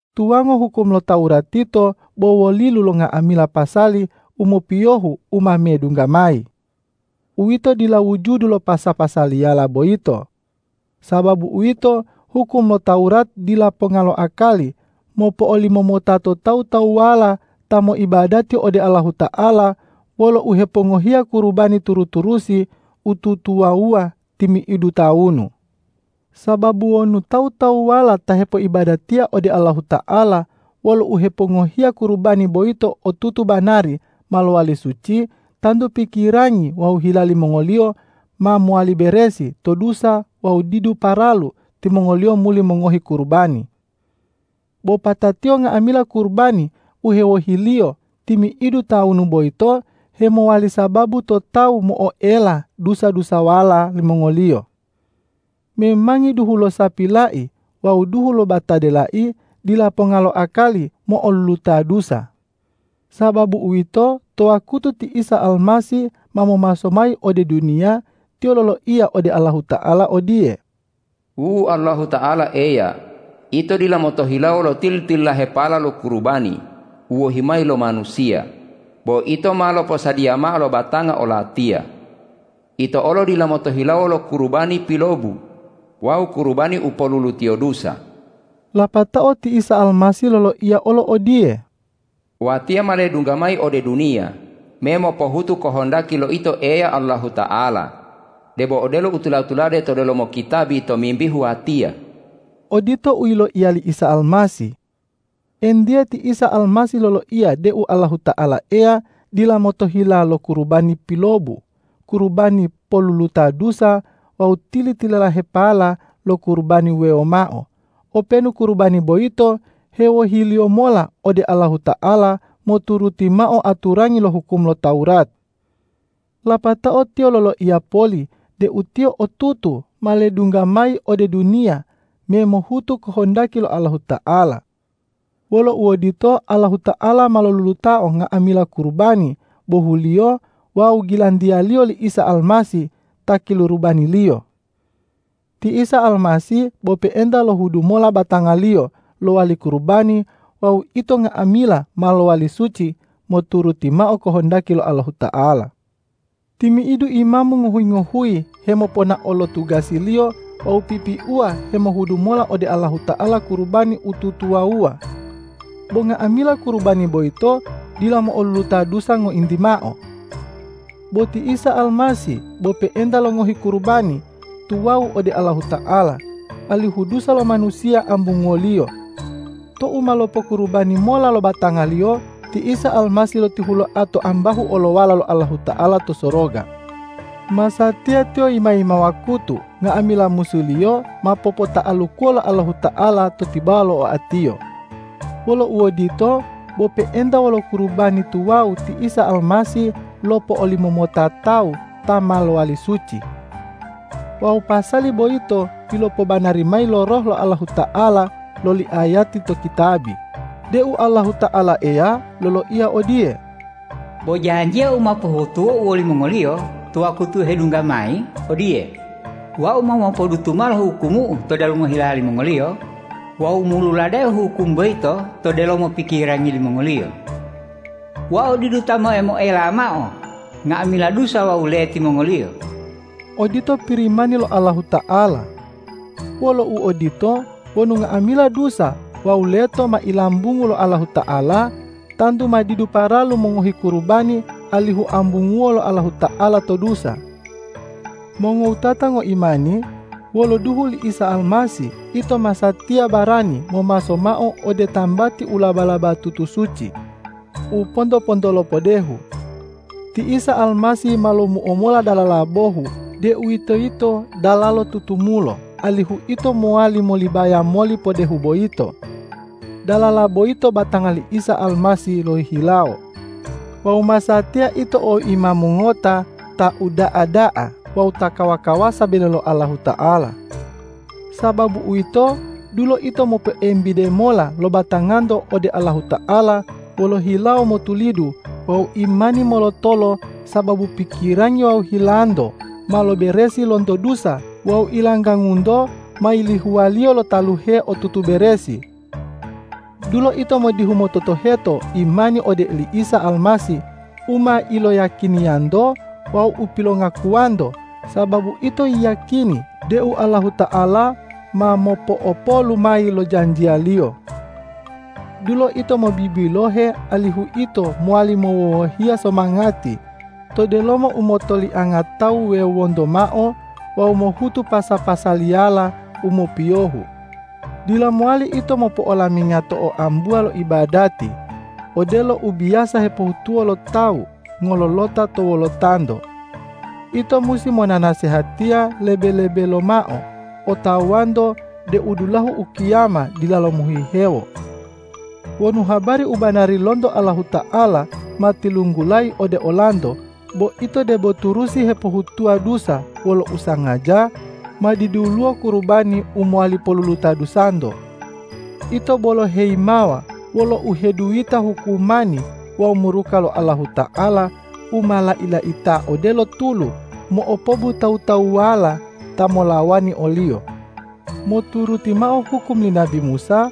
Tuwango hukum lo Tawurat yito bo wolilu lo nga'amila pasali u mopiyohu u ma medungga mayi. Uwito dila wujudu lo pasa-pasaliyala boyito. Sababu uwito, hukum lo Tawurat dila ponga lo akali mopo'olimomota to tawu-tawuwala ta moibadati ode Allahuta'ala wolo uhepongohiya kurubani turu-turusi u tutuwawuwa timi'idu tawunu. Sababu wonu tawu-tawuwala ta hepoibadatiya ode Allahuta'ala wolo uhepongohiya kurubani boyito otutu banari ma lowali suci, tantu pikirangi wawu hila limongoliyo ma mowali beresi to dusa wawu didu paralu timongoliyo muli mongohi kurubani. Bo patatiyo nga'amila kurubani u hewohiliyo timi'idu tawunu boyito hemowali sababu to tawu mo'oela dusa-dusawala limongoliyo. Memangi duhu lo sapi lai wawu duhu lo batade lai dila ponga lo akali mo'oluluta dusa. Sababu uwito, to wakutu ti Isa Almasih ma momaso mayi ode duniya, Tiyo loloiya ode Allahuta'ala odiye,”Wu Allahuta'ala Eya, Ito dila motohilawo lo tili-tililahepala lo kurubani u wohi mayi lo manusiya, bo Ito ma loposadiya mao lo batanga o-Latiya. Ito olo dila motohilawo lo kurubani pilobu wawu kurubani u polulutiyo dusa.” Lapatao ti Isa Almasih loloiya olo odiye,”Watiya ma ledungga mayi ode duniya me mopohutu kohondaki lo Ito Eya Allahuta'ala, debo odelo u tula-tulade to delomo kitabi tomimbihu Watiya.” Odito u yiloiya li Isa Almasih. Entiye, ti Isa Almasih loloiya deu Allahuta'ala Eya dila motohila lo kurubani pilobu, kurubani poluluta dusa wawu tili-tililahepala lo kurubani wuwewo mao, openu kurubani boyito hewohiliyo mola ode Allahuta'ala moturuti mao aturangi lo hukum lo Tawurat. Lapatao Tiyo loloiya poli deu Tiyo otutu ma ledungga mayi ode duniya me mohutu kohondaki lo Allahuta'ala. Wolo uodito, Allahuta'ala ma lolulutao nga'amila kurubani bohuliyo wawu gilantiya-Liyo li Isa Almasih ta kilurubani-Liyo. Ti Isa Almasih bo pe'enta lohudu mola batanga-Liyo lowali kurubani wawu ito nga'amila ma lowali suci moturuti mao kohondaki lo Allahuta'ala. Timi'idu imamu ngohuyi-ngohuyi hemoponao lo tugasiliyo wawu pipiuwa hemohudu mola ode Allahuta'ala kurubani u tutuwawuwa. Bo nga'amila kurubani boyito dila mo'oluluta dusa ngointi mao. Bo ti Isa Almasih bo pe'enta longohi kurubani tuwawu ode Allahuta'ala, alihu dusa lo manusiya ambunguwo-Liyo. Tou ma lopokurubani mola lo batanga-Liyo, ti Isa Almasih lotihuloa to ambahu olowala lo Allahuta'ala to soroga. Masatiya Tiyo yima-yima wakutu nga'amila musu-Liyo ma popota'alukuwo lo Allahuta'ala to tibawa lo oa-Tiyo. Wolo uodito, bo pe'enta wolo kurubani tuwawu ti Isa Almasih lopo'olimomota tawu ta ma lowali suci. Wawu pasali boyito pilopobanari mayi lo Roh lo Allahuta'ala loli ayati to kitabi deu Allahuta'ala Eya loloiya odiye,”Bo janjiya u ma pohutuwo-U wolimongoliyo to wakutu hedunggawa mayi odiye: Wau ma mopodutu mao lo hukumu-U to delomo hila limongoliyo wawu moluladeo hukum boyito to delomo pikirangi limongoliyo. Wau didu ta moe-moela mao nga'amila dusa wawu leti mongoliyo.” Odito Pirimani lo Allahuta'ala. Wolo uodito, wonu nga'amila dusa wawu leto ma ilambungu lo Allahuta'ala, tantu ma didu paralu mongohi kurubani alihu ambunguwo lo Allahuta'ala to dusa. Mongowutata ngoimani, wolo duhu li Isa Almasih ito masatiya barani momaso mao ode tambati u laba-labatutu suci u ponto-pontolo podehu. Ti Isa Almasih ma lomuo mola dalala bohu, deuwitoyito dalalo tutumulo, alihu ito mowali molibaya moli podehu boyito. Dalala boyito batanga li Isa Almasih lohihilawo. Wawu masatiya ito o Imamu ngota ta uda'a da'a wawu ta kawa-kawasa bele lo Allahuta'ala. Sababu uwito, dulo ito mopoembide mola lo batanganto ode Allahuta'ala wolo hilawo motulidu wawu imani molotolo, sababu pikirangi wawu hilanto ma loberesi lonto dusa wawu ilanggangunto ma yilihuwaliyo lo taluhe u otutu beresi. Dulo ito modihu mototoheto imani ode oli Isa Almasih u ma iloyiyakiniyanto wawu u pilongakuwanto, sababu ito yiyakini deu Allahuta'ala ma mopo'opolu mayi lo janjiya-Liyo. Dulo ito mobibilohe alihu ito mowali mowowohiya somangati to delomo u motolianga tawu wuwewonto mao wawu mohutu pasa-pasaliyala u mopiyohu. Dila mowali ito mopo'olaminga to oambuwa lo ibadati, odelo u biyasa hepohutuwo lo tawu ngololota to wolotanto. Ito musi monanasehatiya lebe-lebe lomao otawanto deu dulahu ukiyama dilalo mohihewo. Wonu habari u banari lonto Allahuta'ala ma tilunggulayi ode olanto bo ito debo turusi hepohutuwa dusa wolo usangaja, ma diduluwo kurubani u mowali poluluta dusanto. Ito bolo heyimawa wolo uheduyita hukumani wawu muruka lo Allahuta'ala u ma lai-laita odelo tulu mo'opobu tawu-tawuwala ta molawani o-Liyo. Moturuti mao hukum li nabi Musa,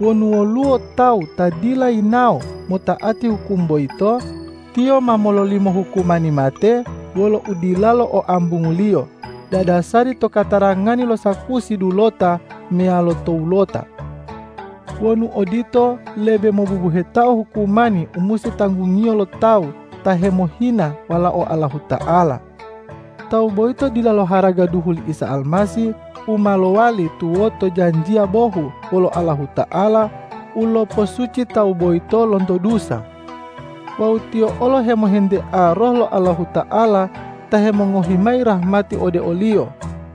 wonu woluwo tawu ta dila yinawo mota'ati hukum boyito, tiyo ma mololimo hukumani mate wolo udilalo o ambunguliyo dadasari to katarangani lo sakusi dulota meyalo towulota. Wonu odito, lebe mobubuhetao hukumani u musi tanggungiyo lo tawu ta hemohina Walao Allahuta'ala. Tawu boyito dila loharaga duhu li Isa Almasih u ma lowali tuwoto janjiya bohu wolo Allahuta'ala u loposuci tawu boyito lonto dusa. Wawu tiyo olo hemohentea Roh lo Allahuta'ala ta hemongohi mayi rahmati ode oliyo.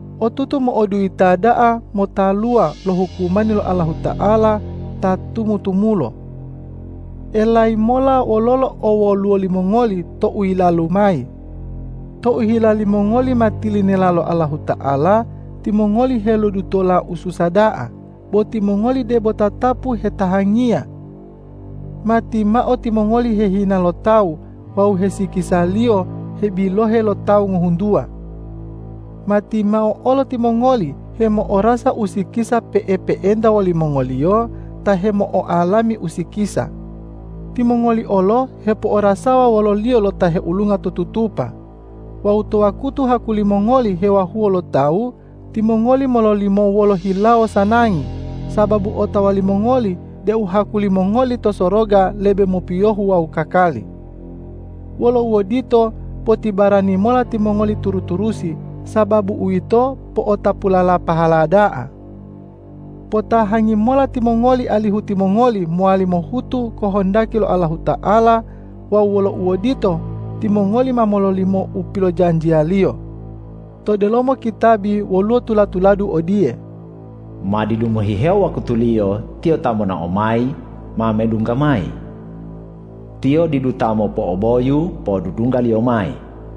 Otutu mo'oduyita da'a motaluwa lo hukumani lo Allahuta'ala ta tumu-tumulo! Elayi mola wololo owwoluwo limongoli tou yilalu mayi. Tou hila limongoli ma tilinela lo Allahuta'ala, timongoli helodutola ususa da'a, bo timongoli debo tatapu hetahangiya. Matimao timongoli hehina lo tawu wawu hesikisaliyo hebilohe lo tawu ngohuntuwa. Matimao olo timongoli hemo'orasa usikisa pe'epe'enta wolimongoliyo ta hemo'oalami usikisa. Timongoli olo hepo'orasawa wololiyo lo ta heulunga to tutupa. Wawu to wakutu haku limongoli hewahuwo lo tawu, timongoli mololimo wolo hilawo sanangi, sababu otawa limongoli deu haku limongoli to soroga lebe mopiyohu wawu kakali. Wolo uodito, potibarani mola timongoli turu-turusi, sababu uwito po'otapulala pahala da'a. Potahangi mola timongoli alihu timongoli mowali mohutu kohondaki lo Allahuta'ala wawu wolo uodito, timongoli ma mololimo u pilojanjiya-Liyo. To delomo kitabi woluwo tula-tuladu odiye,”Ma didu mohihewo wakutuliyo Tiyo ta monao mayi ma medungga mayi. Tiyo didu ta mopo'oboyu podudungga-Liyo mayi.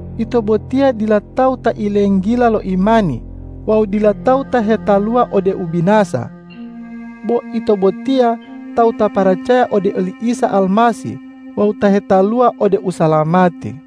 Ito botiya dila tawu ta ilenggila lo imani wawu dila tawu ta hetaluwa ode ubinasa. Bo ito botiya tawu ta paracaya ode oli Isa Almasih wawu ta hetaluwa ode usalamati.